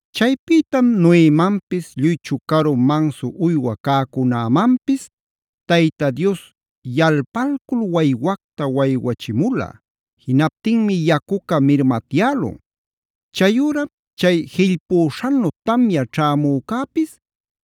Chaypïtam Noemanpis lluy chucaru, mansu uywa cäcunämanpis Tayta Dios yalpalcul waywacta waywachimula. Jinaptinmi yacuca mirmatyälun. Chayüram chay jillpüśhanu tamya ćhämücäpis,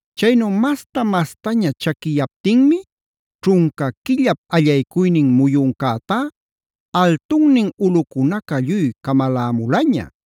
Chaynu masta-mastaña chaquiyaptinmi, ćhunca quillap allaycuynin muyuncätá altunnin ulꞌucunaca lluy camalämulaña.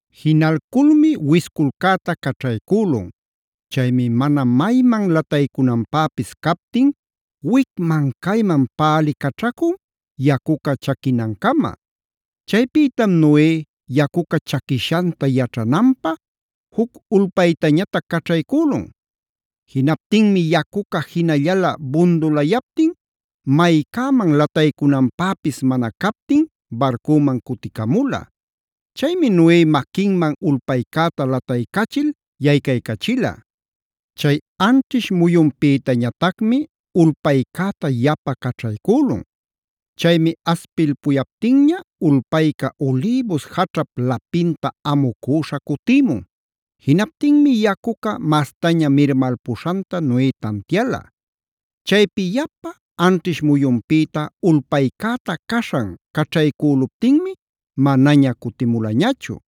Jinalculmi wisculcäta caćhaycülun. Chaymi mana mayman lataycunanpäpis captin wicman cayman pälicaćhacun yacuca chaquinancama. Chaypïtam Noe yacuca chaquishanta yaćhananpä juc ulpaytañatac caćhaycülun. Jinaptinmi yacuca jinallala bundulayaptin maycäman lataycunanpäpis mana captin barcüman cuticamula. Chaymi Noe maquinman ulpaycäta lataycachil yaycaycachila. Chay anćhish muyunpïtañatacmi ulpaycäta yapa caćhaycülun. Chaymi aspilpuyaptinña ulpayca ulïbus jaćhap lapinta amucüśha cutïmun. Jinaptinmi yacuca mastaña mirmalpuśhanta Noe tantiala. Chaypi yapa anćhish muyunpïta ulpaycäta caśhan caćhaycüluptinmi manaña cutimulañachu.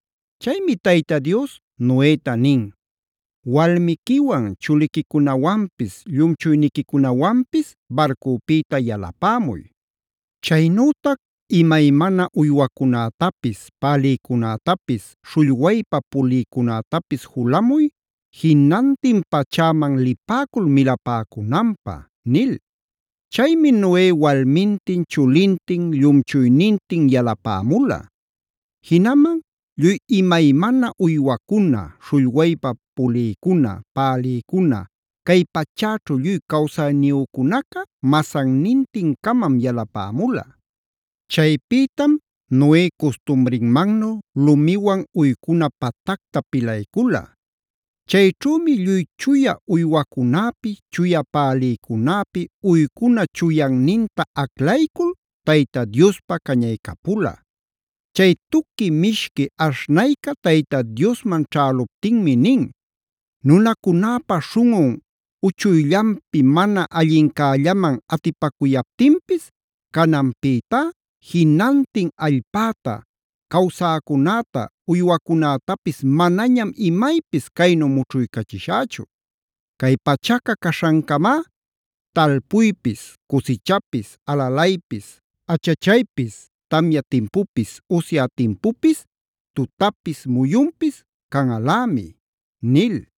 Chaymi Tayta Dios Noeta nin: “Walmiquiwan, chuliquicunawanpis, llumchuyniquicunawanpis barcupïta yalapämuy. Chaynütac imaymana uywacunätapis, pälïcunätapis, śhullwaypa pulïcunätapis julamuy, jinantin pachäman lipäcul milapäcunanpä” nil. Chaymi Noe walmintin, chulintin, llumchuynintin yalapämula. Jinaman lluy imaymana uywacuna, śhullwaypa pulïcuna, pälïcuna, cay pachäćhu lluy cawsayniyücunaca masannintin-camam yalapämula. Chaypïtam Noe custumrinmannu lumiwan uycuna patacta pilaycula. Chayćhümi lluy chuya uywacunäpi, chuya pälïcunäpi uycuna chuyanninta aclaycul Tayta Diospa cañaycapula. Chay tuqui mishqui aśhnayca Tayta Diosman ćhäluptinmi nin: “Nunacunäpa śhunꞌun uchuyllanpi mana allincällaman atipacuyaptinpis cananpïtá jinantin allpäta, cawsäcunäta, uywacunätapis manañam imaypis caynu mućhuycachishächu. “Cay pachaca caśhancamá, talpuypis, cusichapis, alalaypis, achachaypis, tamya timpupis, usya timpupis, tutapis, muyunpis canꞌalämi” nil.